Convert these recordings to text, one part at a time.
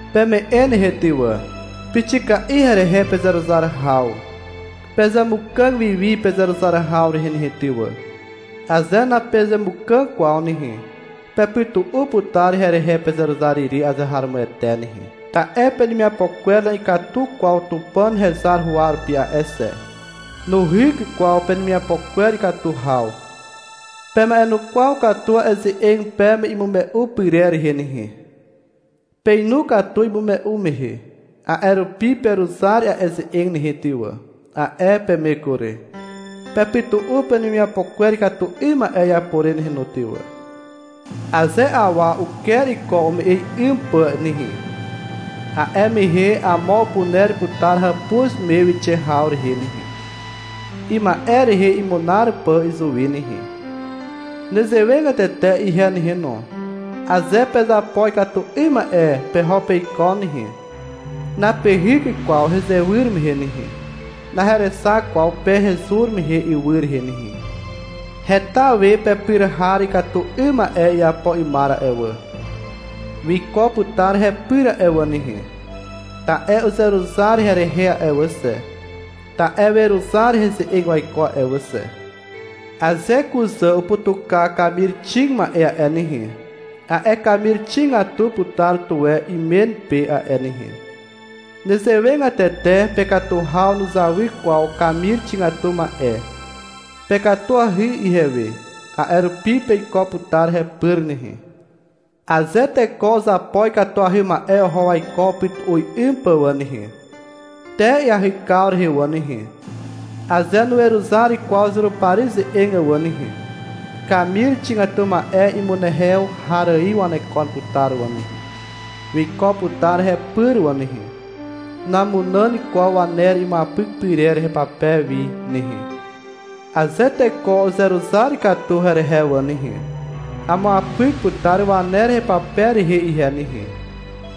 Peme'e nehe ty wà. Pixika'i herehe pezeruzar haw. Pezemukàg wi wi pezeruzar haw rehe nehe ty wà. Aze napezemukàg kwaw nehe, pepytu'u putar herehe pezeruzar ire azeharomoete nehe. Ta'e penemiapo kwer na'ikatu kwaw Tupàn hezar huwa rupi a'e xe. Nuhyk kwaw penemiapo kwer ikatu haw. Pema'enukwaw katu a'e ze'eg peme imume'u pyrer rehe nehe. Peinu katu imume'u mehe. A'e rupi — Peruzar a'e ze'eg nehe ty wà, a'e peme kury. Pepytu'u penemiapo kwer ikatu 'ym ma'e iapo re nehe no ty wà. Aze awa uker iko ume'e 'ym pà nehe, a'e mehe amo upuner putar hàpuz me wixe haw rehe nehe, ima'e rehe imunar pà izuwi nehe. Nezewegatete ihe nehe no, aze pezapo ikatu 'ym ma'e peho peiko nehe, napehyk kwaw hezewyr mehe nehe, naherexak kwaw pe hezur mehe ywy rehe nehe. Heta we pepyr har ikatu 'ym ma'e iapo 'ymar a'e wà. Wiko putar hepyr a'e wà nehe, ta'e uzeruzar herehe a'e wà xe, ta'e weruzar heze'eg waiko a'e wà xe. Aze kuzà uputuka kamir xig ma'e a'e nehe, a'e kamir xigatu putar tuwe imen pe a'e nehe. Nezewegatete pekatu haw nuzawy kwaw kamir xigatu ma'e. Pekatuahy ihewe, a'e rupi peiko putar hepyr nehe. Aze teko uzapo ikatuahy ma'e oho waiko upytu'u 'ym pà wà nehe, te iahykaw rehe wà nehe, aze nuweruzar kwaw Zurupari ze'eg wà nehe, kamir xigatu ma'e imunehew har ài wanekon putar wà nehe. Wiko putar hepyr wà nehe. Namunàn kwaw waner imuapyk pyrer hepape wi nehe. Aze teko uzeruzar katu herehe wà nehe, amuapyk putar waner hepape rehe ihe nehe,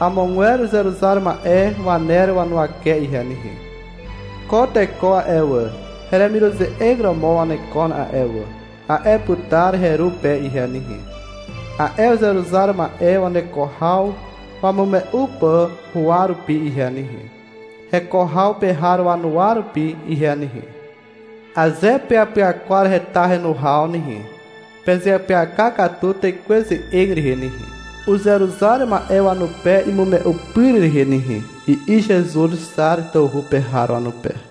amogwer uzeruzar ma'e waner wanuwake ihe nehe. — Ko teko a'e wà, heremiruze'eg romo wanekon a'e wà, a'e putar heru pe ihe nehe, a'e uzeruzar ma'e waneko haw wamume'u pà huwa rupi ihe nehe, heko haw pe har wanuwa rupi ihe nehe. Aze peapyakwar heta henu haw nehe, pezeapyaka katu Tekwe ze'eg rehe nehe, uzeruzar ma'e wanupe imume'u pyr rehe nehe, i'i Zezuz Xar tawhu pe har wanupe.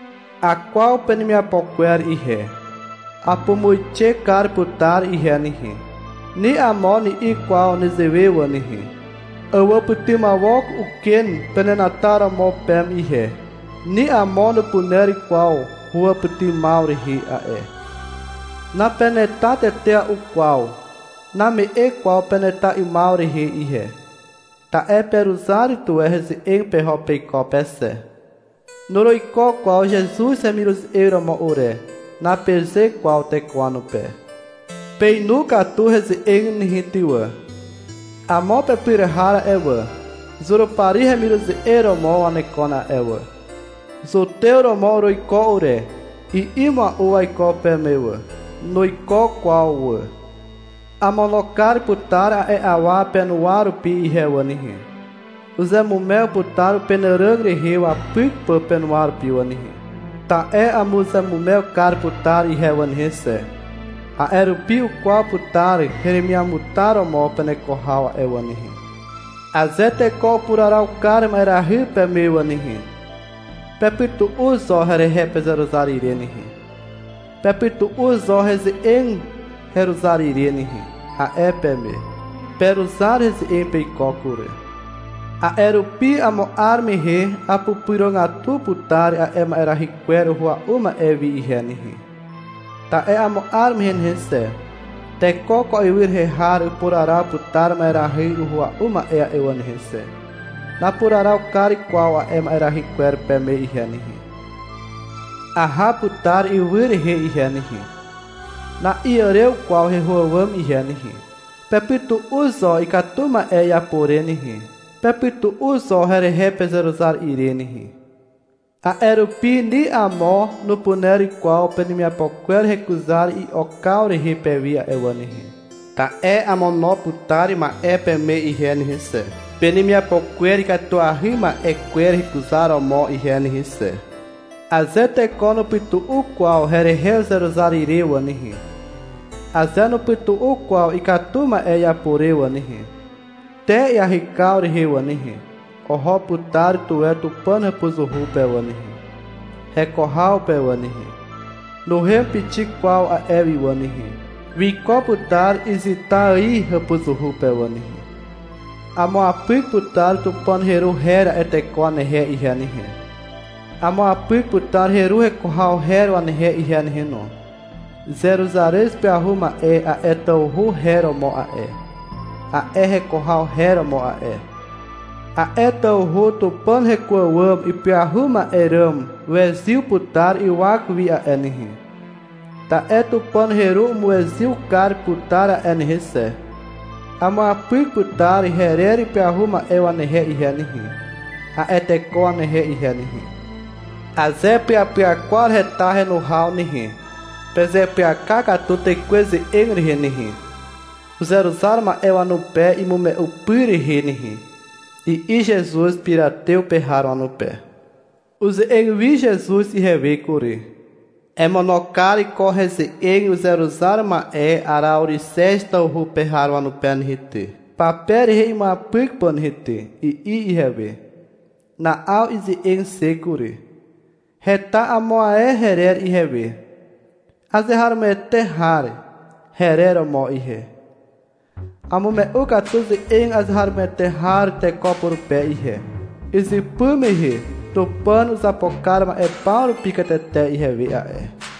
Akwaw penemiapo kwer ihe. Apumuixe kar putar ihe nehe. Ni amo ni'i kwaw nezewe wà nehe. Awàpytymawok uken penenataromo peme ihe. Ni amo nupuner kwaw huwàpytymaw rehe a'e. Napeneta tetea'u kwaw. Name'e kwaw peneta 'ymaw rehe ihe, ta'e peruzar tuwe heze'eg peho peiko pe xe. -Nuruiko kwaw Zezuz hemiruze'eg romo ure, napeze kwaw teko wanupe. Peinu katu heze'eg nehe ty wà. Amo pepyr har a'e wà, Zurupari hemiruze'eg romo wanekon a'e wà. — Zutew romo uruiko ure, i'i mua'u waiko peme wà. Nuiko kwaw wà. Amono kar putar a'e awa penuwa rupi ihe wà nehe. Uzeamumew putar upenàràg rehe wapyk pà penuwa rupi wà nehe. Ta'e amuzeamumew kar putar ihe wà nehe xe. A'e rupi ukwaw putar heremiamutar romo peneko haw a'e wà nehe. — Aze teko upuraraw kar ma'erahy peme wà nehe, pepytu'u zo herehe pezeruzar ire nehe, pepytu'u zo heze'eg heruzar ire nehe, a'e peme. Peruzar heze'eg peiko kury. A'e rupi amo 'ar mehe apupyrogatu putar a'e ma'erahy kwer uhua'u ma'e wi ihe nehe. Ta'e amo 'ar mehe nehe xe, teko ko ywy rehe har upuraraw putar ma'erahy uhua'u ma'e a'e wà nehe xe. Napuraraw kar kwaw a'e ma'erahy kwer peme ihe nehe. Aha putar ywy rehe ihe nehe. Na'iàrew kwaw heho àwàm ihe nehe. Pepytu'u zo ikatu ma'e iapo re nehe. Pepytu'u zo herehe pezeruzar ire nehe. A'e rupi ni amo nupuner kwaw penemiapo kwer hekuzar i'okaw rehe pewi a'e wà nehe, ta'e amono putar ma'e peme ihe nehe xe, penemiapo kwer ikatuahy ma'e kwer hekuzaromo ihe nehe xe. Aze teko nupytu'u kwaw herehe uzeruzar ire wà nehe, aze nupytu'u kwaw ikatu ma'e iapo re wà nehe, te iahykaw rehe wà nehe, oho putar tuwe Tupàn hàpuzuhu pe wà nehe, heko haw pe wà nehe. Nuhem pixik kwaw a'e wi wà nehe. Wiko putar izyta ài hàpuzuhu pe wà nehe. Amuapyk putar Tupàn heru her a'e teko wanehe ihe nehe, amuapyk putar heru heko haw her wanehe ihe nehe no. Zeruzarez ipyahu ma'e a'e tawhu her romo a'e, a'e heko haw her romo a'e. A'e tawhu Tupàn heko àwàm ipyahu ma'e ràm wezyw putar ywak wi a'e nehe, ta'e Tupàn heru umuezyw kar putar a'e nehe xe. Amuapyk putar herer ipyahu ma'e wanehe ihe nehe, a'e teko wanehe ihe nehe. Aze peapyakwar heta henu haw nehe, pezeapyaka katu Tekwe ze'eg rehe nehe, uzeruzar ma'e wanupe imume'u pyr rehe nehe, i'i Zezuz Piratew pe har wanupe. Uze'eg wi Zezuz ihewe kury. — Emono kar ko heze'eg uzeruzar ma'e Araorixez tawhu pe har wanupe nehe ty, pape rehe imuapyk pà nehe ty, i'i ihewe. Na'aw ize'eg xe kury. — Heta amo ae herer ihewe. — Azeharomoete har, herer romo ihe. Amume'u katu ze'eg azeharomoete har teko purupe ihe. Izypy mehe Tupàn uzapo kar ma'e paw rupi katete ihewe a'e.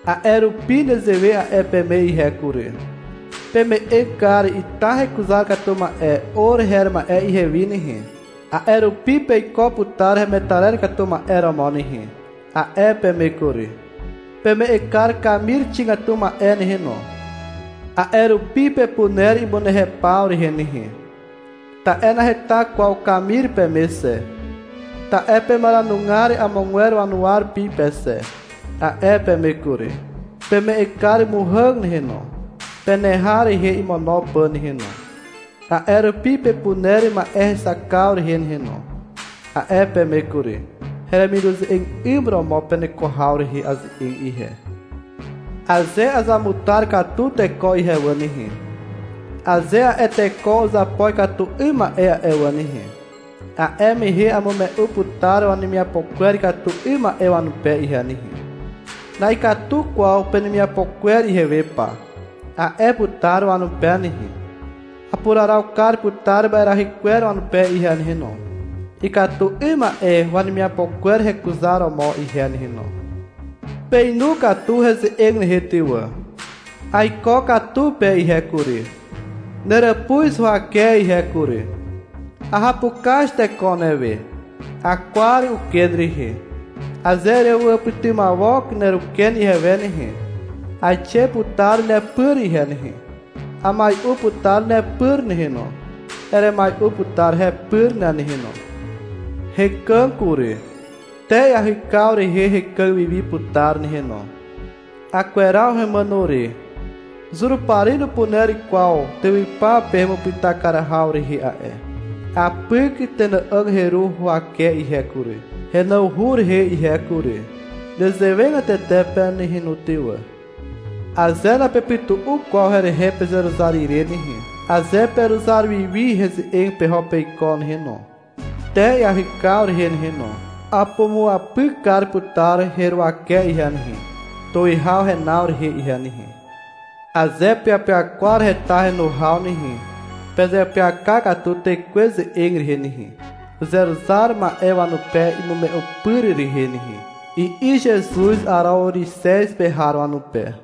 A'e rupi nezewe a'e peme ihe kury. — Peme'eg kar ita hekuzar katu ma'e or her ma'e ihewi nehe, a'e rupi peiko putar hemetarer katu ma'e romo nehe, a'e peme kury. — Peme'eg kar kamir xigatu ma'e nehe no. A'e rupi pepuner imunehew paw rehe nehe, ta'e naheta kwaw kamir peme xe, ta'e pemaranugar amogwer wanuwa rupi pe xe, a'e peme kury. — Peme'eg kar muhàg nehe no, peneha rehe imono pà nehe no. A'e rupi pepuner ma'erexakaw rehe nehe no, a'e peme kury. (Heremiruze'eg 'ym romo peneko haw rehe aze'eg ihe.) Aze azamutar katu teko ihe wà nehe, aze a'e teko uzapo ikatu 'ym ma'e a'e wà nehe, a'e mehe amume'u putar wanemiapo kwer ikatu 'ym ma'e wanupe ihe nehe. — Na'ikatu kwaw penemiapo kwer ihewe pa, a'e putar wanupe nehe. Apuraraw kar putar ma'erahy kwer wanupe ihe nehe no, ikatu 'ym ma'e wanemiapo kwer hekuzaromo ihe nehe no. Peinu katu heze'eg nehe ty wà. Aiko katu pe ihe kury, neràpuz huwake ihe kury. Ahapukaz teko newe. Akwar uken rehe. Aze erewàpytymawok neruken ihewe nehe, aixe putar nepyr ihe nehe. Amai'u putar nepyr nehe no. Eremai'u putar hepyr ne nehe no. Hekàg kury. Te iahykaw rehe hekàg wiwi putar nehe no. Akweraw hemàno re. Zurupari nupuner kwaw tywypaw pe hemupyta kar haw rehe a'e. Apyk tenà'àg heru huwake ihe kury, henawhu rehe ihe kury. Nezewegatete pe nehe no ty wà. Aze napepytu'u kwaw herehe pezeruzar ire nehe, aze peruzar wi wi heze'eg peho peiko nehe no, te iahykaw rehe nehe no, apumuapyk kar putar heruwake ihe nehe, tuwihaw henaw rehe ihe nehe. Aze peapyakwar heta henu haw nehe, pezeapyaka katu Tekwe ze'eg rehe nehe, uzeruzar ma'e wanupe imume'u pyr rehe nehe, i'i Zezuz Araorixez pe har wanupe.